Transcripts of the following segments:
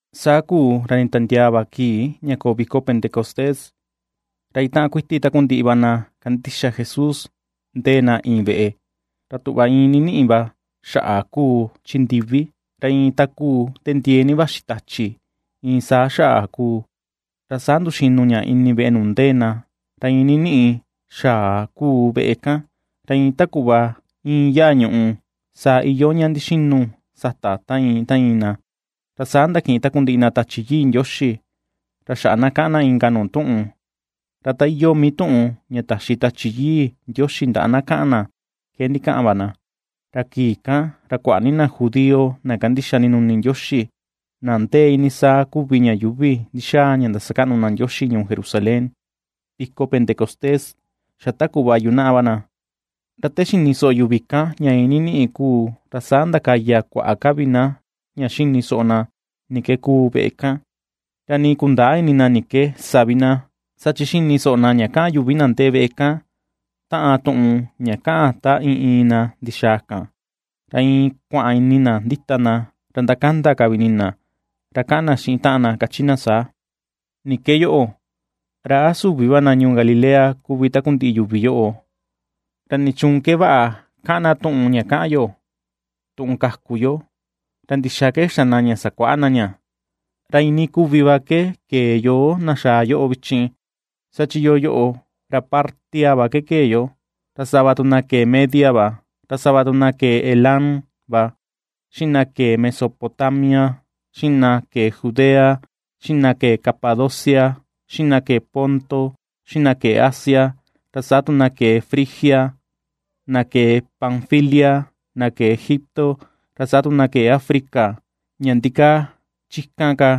Saa kuu ra nditiandiaa va kii ña koo viko Pentecostés, ra itaꞌan kuiti takundiꞌi va na kandixa Jesús ndéé na iin veꞌe. Ra tuꞌva iin niniꞌi va xaꞌa ^kuu chi ndiví, ra iin ta ^kuu te ndiee ni vaxi tachi, iin saa xaꞌa kuu, ra saa ndu̱xínu̱ ña ini veꞌe nuu ndéé na, ra iin niniꞌi xaꞌa kuu veꞌe kan. Ra iin ta kuꞌva íin yaa ñùꞌù, saa iyoo ña ndixinu sata ta iin ta iin na. Ra saa ndakiꞌin takundiꞌi na Tachi Yii Ndioxi, ra xaꞌa na ^kaꞌan na inka nuu tuꞌun, ra ta iyoo mii tuꞌun ña taxi Tachi Yii Ndioxi ndaꞌa na kaꞌan na, ke ndikaꞌan va na. Ra kii kan, ra kuaꞌa ni na judío na ^kandixa ndinuni Ndioxi, na ndéé iinii saa kuvi ña yuuvi ndi̱xa̱a̱ ña ndasakaꞌnu na Ndioxi ñuu Jerusalén, viko Pentecostés xa ta kuꞌva yunaꞌa va na. Ra te xini soꞌo yuvi kan ña iin níníꞌi kuu ra saa xaꞌa ndakaya kuaꞌa ka vi na ña xini soꞌo na ni ke kúú veꞌe kan, ra nii kundäa ini na ni ke sa vi na, saa chi ^xini soꞌo na ña kaꞌan yuvi na ndee veꞌe kan taꞌan tuꞌun ña kaꞌan ta iin iin na ndixaa kan. Ra iin kua̱ꞌa̱n ini na ndita na, ra ndakanda ka vi ini na, ra kaꞌan na xiꞌin taꞌan na, kachi na saa: ―¿Ni ke yoꞌo? ¿Ra a süvi va na ñuu Galilea kuvi takundiꞌi yuvi yoꞌo? ¿Ra ni chuun ke vaꞌa ^kaꞌan na tuꞌun ña kaꞌan yo, tuꞌun ka̱ku yo? ¿Ra ndixaa ke xa̱ na ña sakuaꞌa na ña? Ra iinii kuvi va ke kee yoo, na xaa yoꞌo vichin; saa chi yoo yoꞌo ra Partia va kee yo, ra sava tu na ke̱e Media va, ra sava tu na ke̱e Elam va, xiꞌin na kee Mesopotamia, xiꞌin na ke̱e Judea, xiꞌin na ke̱e Capadocia, xiꞌin na ke̱e Ponto, xiꞌin na ke̱e Asia, ra saa tu na ke̱e Frigia, na ke̱e Panfilia, na kee Egipto, ra saa tu na ke̱e África, ña ndikaa chikan ka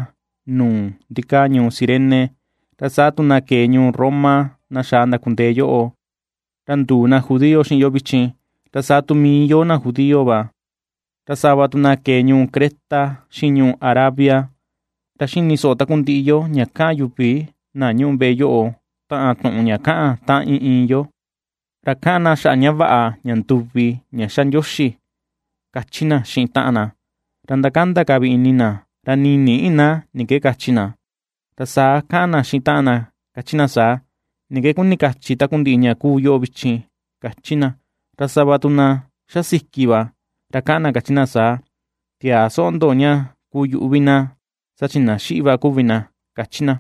nuu ndikaa ñuu Cirene; ra saa tu na ke̱e ñuu Roma na xaa ndakundee yoꞌo, ra nduu na judío xiꞌin yo vichin, ra saa tu mii yo na kuu judío va; Ra sava tu na kee ñuu Creta xiꞌin ñuu Arabia. Ra ^xini soꞌo takundiꞌi yo ña ^kaꞌan yuvi na ñúꞌu veꞌe yoꞌo taꞌan tuꞌun ña kaꞌan ta iin iin yo. Ra kaꞌan na xaꞌa ña vaꞌa, ña nduvi ña xa Ndioxi ―^kachi na xiꞌin taꞌan na. Ra ndakanda ka vi ini na ra nii nïꞌi na ni ke kachi na, ra saa ^kaꞌan na xiꞌin taꞌan na ^kachi na saa: ―¿Ni ke kuni ^kachi takundiꞌi ña kuu yoꞌo vichin? ―^kachi na. Ra sava tu na ^xasiki va, ra ^kaꞌan na ^kachi na saa: ―Tiäa soꞌo ndo ña kuu yuꞌu vi na, saa chi na xíꞌí va kuvi na ―kachi na.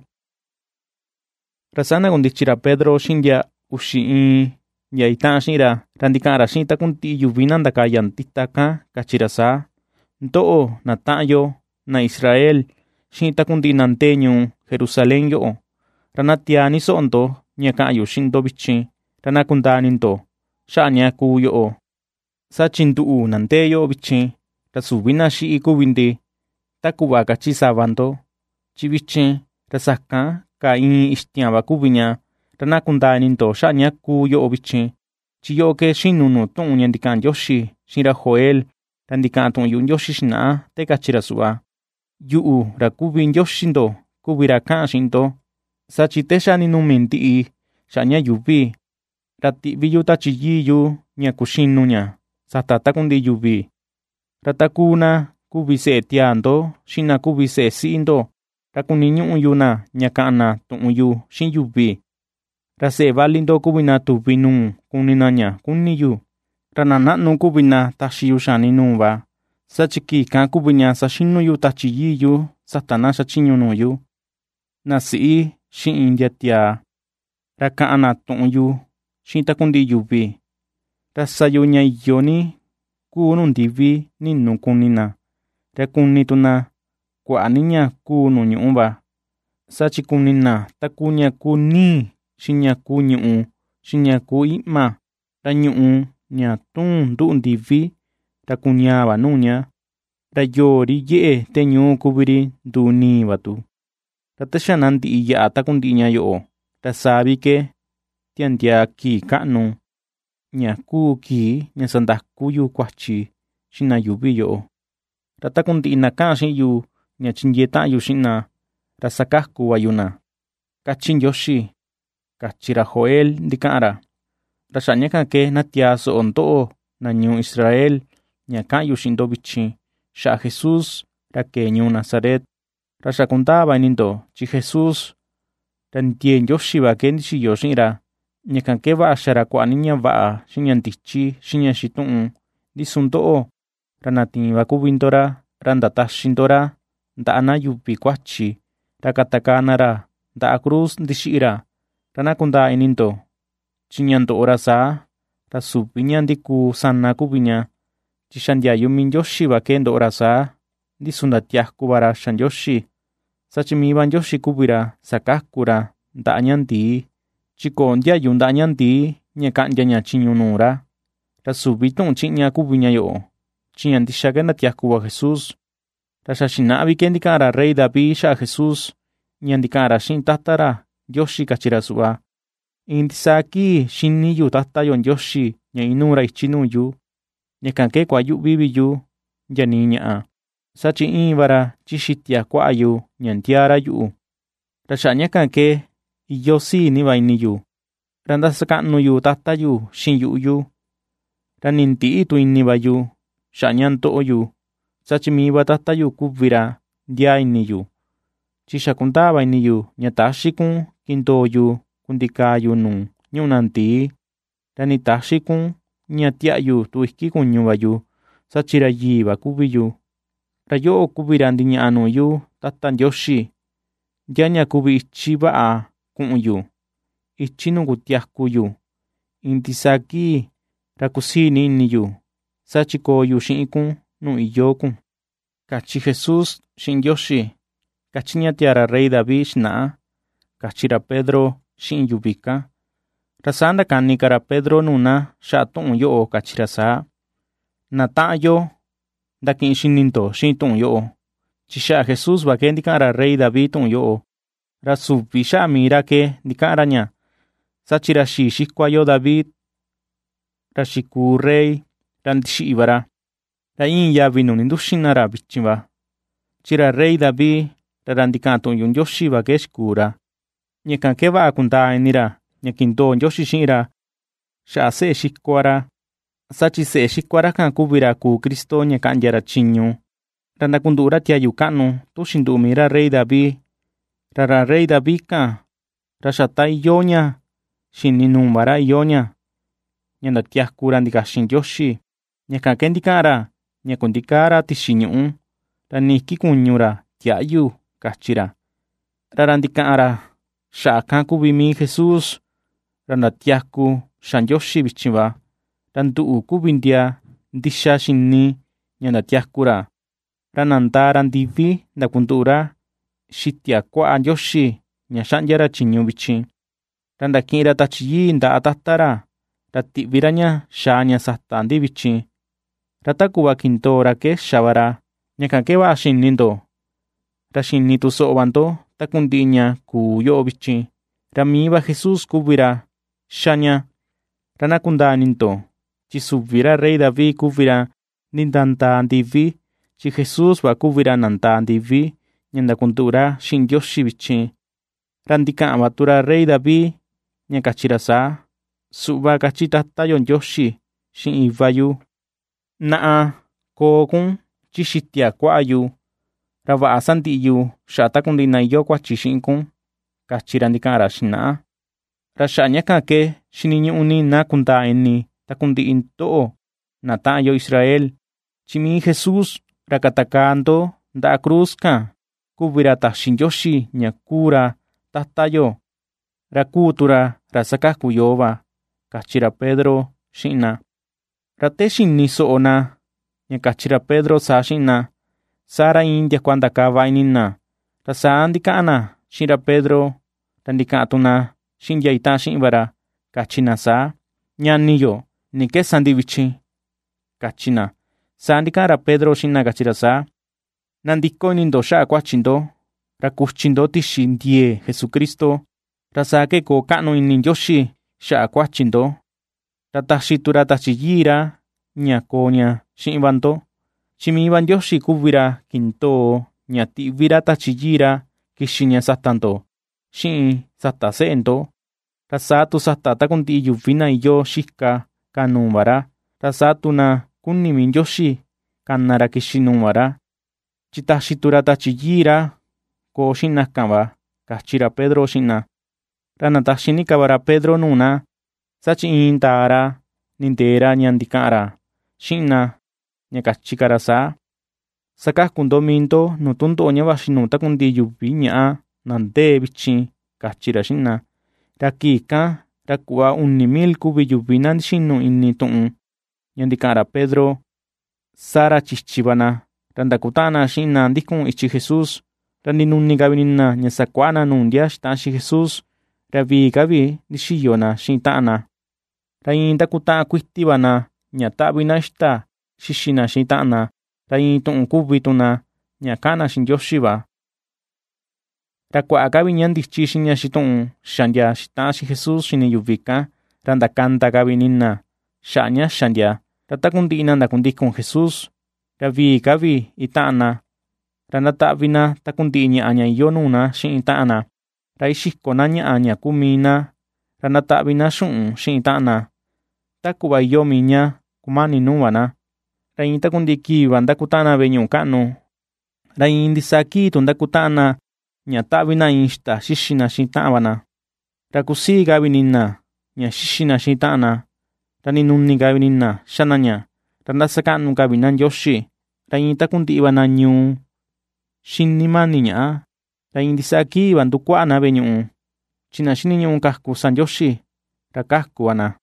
Ra saa ndakundichi ra Pedro xiꞌin ndia uxi iin ndia itaꞌan xiꞌin ra, ra ndikaꞌan ra xiꞌin takundiꞌi yuvi na ndakaya ndita kan, kachi ra saa: ―Ndoꞌo, na taꞌan yo, na Israel, xiꞌin takundiꞌi na ndee ñuu Jerusalén yoꞌo, ra na tiaa ni soꞌo ndo ña ka̱ꞌa̱n yu xiꞌin ndo vichin, ra na kundaa ini ndo xaꞌa ña kúú yoꞌo. Saa chi nduꞌu, na ndee yoꞌo vichin, ra süvi na xíꞌí kuvi ndi, ta kuꞌva kachi sava ndo, chi vichin ra sakan kaa ìi̱n ixtiaan va kuvi ña. Ra na kundaa ini ndo xaꞌa ña kúú yoꞌo vichin, chi yoꞌo ke ^xinu nuu tuꞌun ña ndikaꞌan Ndioxi xiꞌin ra Joel, ra ndikaꞌan tuꞌun yuꞌu Ndioxi xinaꞌa, te kachi ra suꞌva: Yuꞌu, ra kuvi Ndioxi ndo kuvi ra kaꞌan xiꞌin ndo; saa chi te xa ninumi ndiꞌi xaꞌa ña yuuvi, ra tiꞌví yu Tachi Yii yu ña kuxinu ña sata takundiꞌi yuvi; ra takuu na kuvi seꞌe tiaa ndo xiꞌin na kuvi seꞌe siꞌi ndo, ra kuniñuꞌu yu na ña ka̱ꞌa̱n na tuꞌun yu xiꞌin yuvi; Ra seꞌe vali ndo kuvi na tuvi nuu kuni na ña kúni̱ yu; ra na naꞌnu kuvi na taxi yu xani nuu va. Saa chi kii kan kuvi ña saxinu yu Tachi Yii yu sata na xa chiñu nuu yu, na siꞌi xiꞌin ndia tiaa, ra kaꞌan na tuꞌun yu xiꞌin takundiꞌi yuvi. Ra sa yu ña iyo ni kuu nuu ndivi ni̱nù kuni na; ra kuni tu na kuaꞌa ni ña kuu nuu ñuꞌú va: saa chi kuni na takuu ña kuu nii xiꞌin ña kuu ñùꞌù xiꞌin ña kuu iꞌma. Ra ñuꞌù, ña ^túu̱n nduꞌu ndivi, ra kuñaà va nuu ña, ra yoo, ri yeꞌe te ñuu kuvi ri nduu nii va tu, ra te xa na ndiꞌi yaꞌa takundiꞌi ña yoꞌo, ra saa vi ke tia̱ndiaa kii káꞌnu, ña kuu kii ña sandakú yu kuachi xiꞌin na yuvi yoꞌo. Ra takundiꞌi na ^kaꞌan xiꞌin yu ña chindiee taꞌan yu xiꞌin na, ra sakaku va yu na, ^kachi Ndioxi, kachi ra Joel ndikaꞌan ra. ’Ra xaꞌa ña kan ke na tiaa soꞌo ndoꞌo na ñuu Israel ña ka̱ꞌa̱n yu xiꞌin ndo vichin xaꞌa Jesús ra ke̱e ñuu Nazaret: Ra xa kundaa va ini ndo chi Jesús, ra ndiee Ndioxi va ke ndixiyo xiꞌin ra; ña kan ke vaꞌa xa̱ ra kuaꞌa ni ña vaꞌa xiꞌin ña ndichi, xiꞌin ña xituꞌun. Ndi su ndoꞌo, ra na tiin va kuvi ndo ra, ra ndataxi ndo ra ndaꞌa na yuvi kuachi, ra katakaa na ra ndaꞌa cruz ndixiꞌi ra. Ra na kundaa ini ndo chi ña ndoꞌo ra saa, ra süvi ña ndikuu sana kuvi ña, chi xa̱ ndiayu mii Ndioxi va ke ndoꞌo ra saa. Ndi su ndatiaku va ra xa Ndioxi, saa chi mii va Ndioxi kuvi ra sakaku ra ndaꞌa ña ndii, chi köo ndiayu ndaꞌa ña ndii ña kaꞌndia ña chiñu nuu ra. Ra süvi tuꞌun chiꞌña kuvi ña yoꞌo, chi ña ndixa ke ^ndatiaku va Jesús, ra xa xinaꞌa vi ke ndikaꞌan ra rey David xaꞌa Jesús, ña ndikaꞌan ra xiꞌin Tata ra Ndioxi kachi ra suꞌva: Iin ndisaa kii xíní yu Tata yo Ndioxi ña ínúú ra ichi nuu yu; ña kan ke kuayüꞌvi vi yu ndia nii ñaꞌa, saa chi íin va ra chi xitia kuaꞌa yu ña ndiaa ra yuꞌu. Ra xaꞌa ña kan ke iyoo sii ni va ini yu, ra ^ndasakaꞌnu yu Tata yu xiꞌin yuꞌu yu, ra nii ndïꞌi tu ini va yu xaꞌa ña ^ndoꞌo yu, saa chi mii va Tata yu kuvi ra ^ndiaa ini yu; chi xa ^kundaa va ini yu ña täxí kun kindoo yu kundikaa yu nuu ñúꞌu na ndii; ra nii täxí kun ña tiaꞌyu tu iki kuñu va yu, saa chi ra yii va kuvi yu. Ra yoꞌo kuvi ra ndiñaꞌa nuu yu, Tata Ndioxi, ndia ña kuvi ichi vaꞌa ku̱ꞌu̱n yu, ichi nuu kutiaku yu iin ndisaa kii; ra kusiì ni ini yu, saa chi koo yu xiꞌin kun nuu iyoo kun, kachi Jesús xiꞌin Ndioxi, ^kachi ña tiaa ra rey David xinaꞌa ―kachi ra Pedro xiꞌin yuvi kan. Ra saa ndakani ka ra Pedro nuu na xaꞌa tuꞌun yoꞌo kachi ra saa: ―Na taꞌan yo ndakiꞌin xini ndo xiꞌin tuꞌun yoꞌo, chi xaꞌa Jesús va ke ndikaꞌan ra rey David tuꞌun yoꞌo, ra süvi xaꞌa mii ra ke ndikaꞌan ra ña, saa chi ra xii xikua yo David, ra xikuu rey, ra ndixiꞌi va ra, ra íin yavi nuu ninduxin na ra vichin va. Chi ra rey David, ra ra ndikaꞌan tuꞌun yuꞌu Ndioxi va ke xikuu ra, ña kan ke vaꞌa kundaa ini ra ña kindoo Ndioxi xiꞌin ra xaꞌa seꞌe xikua ra, saa chi seꞌe xikua ra kan kuvi ra kuu Cristo, ña kaꞌndia ra chiñu, ra ndakunduꞌu ra tiayu kaꞌnu, tu xinduꞌu mii ra rey David. Ra ra rey David kan, ra xa ta iyoo ña xi̱ni nuu va ra iyoo ña, ña ndatiaku ra ndikaxin Ndioxi. Ña kan ke ndikaꞌan ra ña kundikäa ra tixi ñuꞌú, ra nii iki kuñu ra tiäꞌyu, kachi ra. Ra ra ndikaꞌan ra xaꞌa kan kuvi mii Jesús, ra ndatiaku xa Ndioxi vichin va. Ra nduꞌu kuvi ndia ndixa xini ña ndatiaku ra. Ra nadaa ra ndivi ndakunduꞌu ra xitia kuaꞌa Ndioxi ña ^xaꞌndia ra chiñu vichin; ra ndakiꞌin ra Tachi Yii ndaꞌa Tata ra, ra tiꞌvi ra ña xaa ña sata ndi vichin, ra ta kuꞌva kindoo ra ke xa va ra. Ña kan ke vaꞌa xini ndo, ra xini tu soꞌo va ndo takundiꞌi ña kuu yoꞌo vichin, ra mii va Jesús kuvi ra ^xa ña. Ra na kundaa ini ndo, chi süvi ra rey David kuvi ra ndindaa ndivi, chi Jesús va kuvi ra nandaa ndivi ña ndakunduꞌu ra xiꞌin Ndioxi vichin. Ra ndikaꞌan va tu ra rey David ña káchí ra saa: Suꞌva kachi Tata yo Ndioxi xiꞌin Iva yu: Naꞌa, koo kun chi xitia kuaꞌa yu, ra vaꞌa sandiꞌi yu xaꞌa takundiꞌi na iyoo kuachi xiꞌin kun, kachi ra ndikaꞌan ra xinaꞌa. ’Ra xaꞌa ña kan ke xiniñuꞌu ni na kundaa ini takundiꞌi ndoꞌo, na taꞌan yo Israel, chi mii Jesús, ra katakaa ndo ndaꞌa cruz kan kuvi ra taxi Ndioxi ña kuu ra Tata yo, ra kuu tu ra ra sakaku yoo va ―kachi ra Pedro xiꞌin na. Ra te xini soꞌo na ña kachi ra Pedro saa xiꞌin na, saa ra iin ndiakua ndakava ini na, ra saa ndikaꞌan na xiꞌin ra Pedro ra ndikaꞌan tu na xiꞌin ndia itaꞌan xiꞌin va ra, káchí na saa: ―Ñani yo, ¿ni ke sa ndi vichin? ―kachi na. Saa ndikaꞌan ra Pedro xiꞌin na kachi ra saa: ―Nandiko ini ndo xaꞌa kuachi ndo, ra kuchi ndo tixi ndiee Jesucristo, ra saa ke koo káꞌnu ini Ndioxi xaꞌa kuachi ndo, ra taxi tu ra Tachi Yii ra ña koo ña xiꞌin va ndo. Chi mii va Ndioxi kuvi ra kindoo ña tiꞌví ra Tachi Yii ra kixi ña sata ndo xiꞌin sata seꞌe ndo, ra saa tu sata takundiꞌi yuvi na iyoo xika ka nuu va ra; ra saa tu na kuni mii Ndioxi kana ra kixi nuu va ra, chi taxi tu ra Tachi Yii ra koo xiꞌin na kan va ―kachi ra Pedro xiꞌin na. Ra ndataxi ni ka va ra Pedro nuu na, saa chi iin ndaa ra nindeè ra ña ndikaꞌan ra xiꞌin na, ña kachi ka ra saa: ―Sakaku ndo mii ndo nuu tundoꞌo ña vaxi nuu takundiꞌi na yuvi ñaꞌa na ndee vichin ―kachi ra xiꞌin na. Ra kii kan ra kuꞌva uni mil kuvi yuvi na ndixinu ini tuꞌun ña ndikaꞌan ra Pedro, saa ra chichi va na, ra ndakutaꞌan na xiꞌin na ndíku̱n ichi Jesús. Ra ndinuni ka vi ini na ña sakuaꞌa na nuu ndia xitaꞌan xiꞌin Jesús, ra vii ka vi ndixiyo na xiꞌin taꞌan na, ra iin ^ndakutaꞌan kuiti va na ña taꞌvi na ixta xixi na xiꞌin taꞌan na, ra iin tuꞌun kuvi tu na ña kaꞌan na xiꞌin Ndioxi va. Ra kuaꞌa ka vi ña ndichi xiꞌin ña xituꞌun xá ndia xitaꞌan xiꞌin Jesús xini yuvi kan, ra ^ndakanda ka vi ini na xaꞌa ña xa ndia. Ra takundiꞌi na ndakundikun Jesús ra vii ka vi itaꞌan na; ra ^ndataꞌvi na takundiꞌi ñaꞌa ña iyoo nuu na xiꞌin taꞌan na. Ra ixiko na ñaꞌa ña kuu mii na ra ndataꞌvi na xuꞌun xiꞌin taꞌan na, ta kuꞌva iyoo mii ña kumani nuu va na. Ra iin takundiꞌi kii va ^ndakutaꞌan na veꞌe ñuꞌu kaꞌnu, ra iin ndisaa kii tu ndakutaꞌan na ña taꞌvi na ixta xixi na xiꞌin taꞌan va na, ra kusii ka vi ini na ña xixi na xiꞌin taꞌan na, ra ndinuni ka vi ini na xá na ña. Ra ^ndasakaꞌnu ka vi na Ndioxi; ra iin takundiꞌi va na ñuu xíni máni̱ ñaꞌa; ra iin ndisaa kii va ndúkuáꞌa̱ na veꞌe ñuꞌu, chi na xiniñuꞌu ^kaku sa Ndioxi, ra ^kaku va na.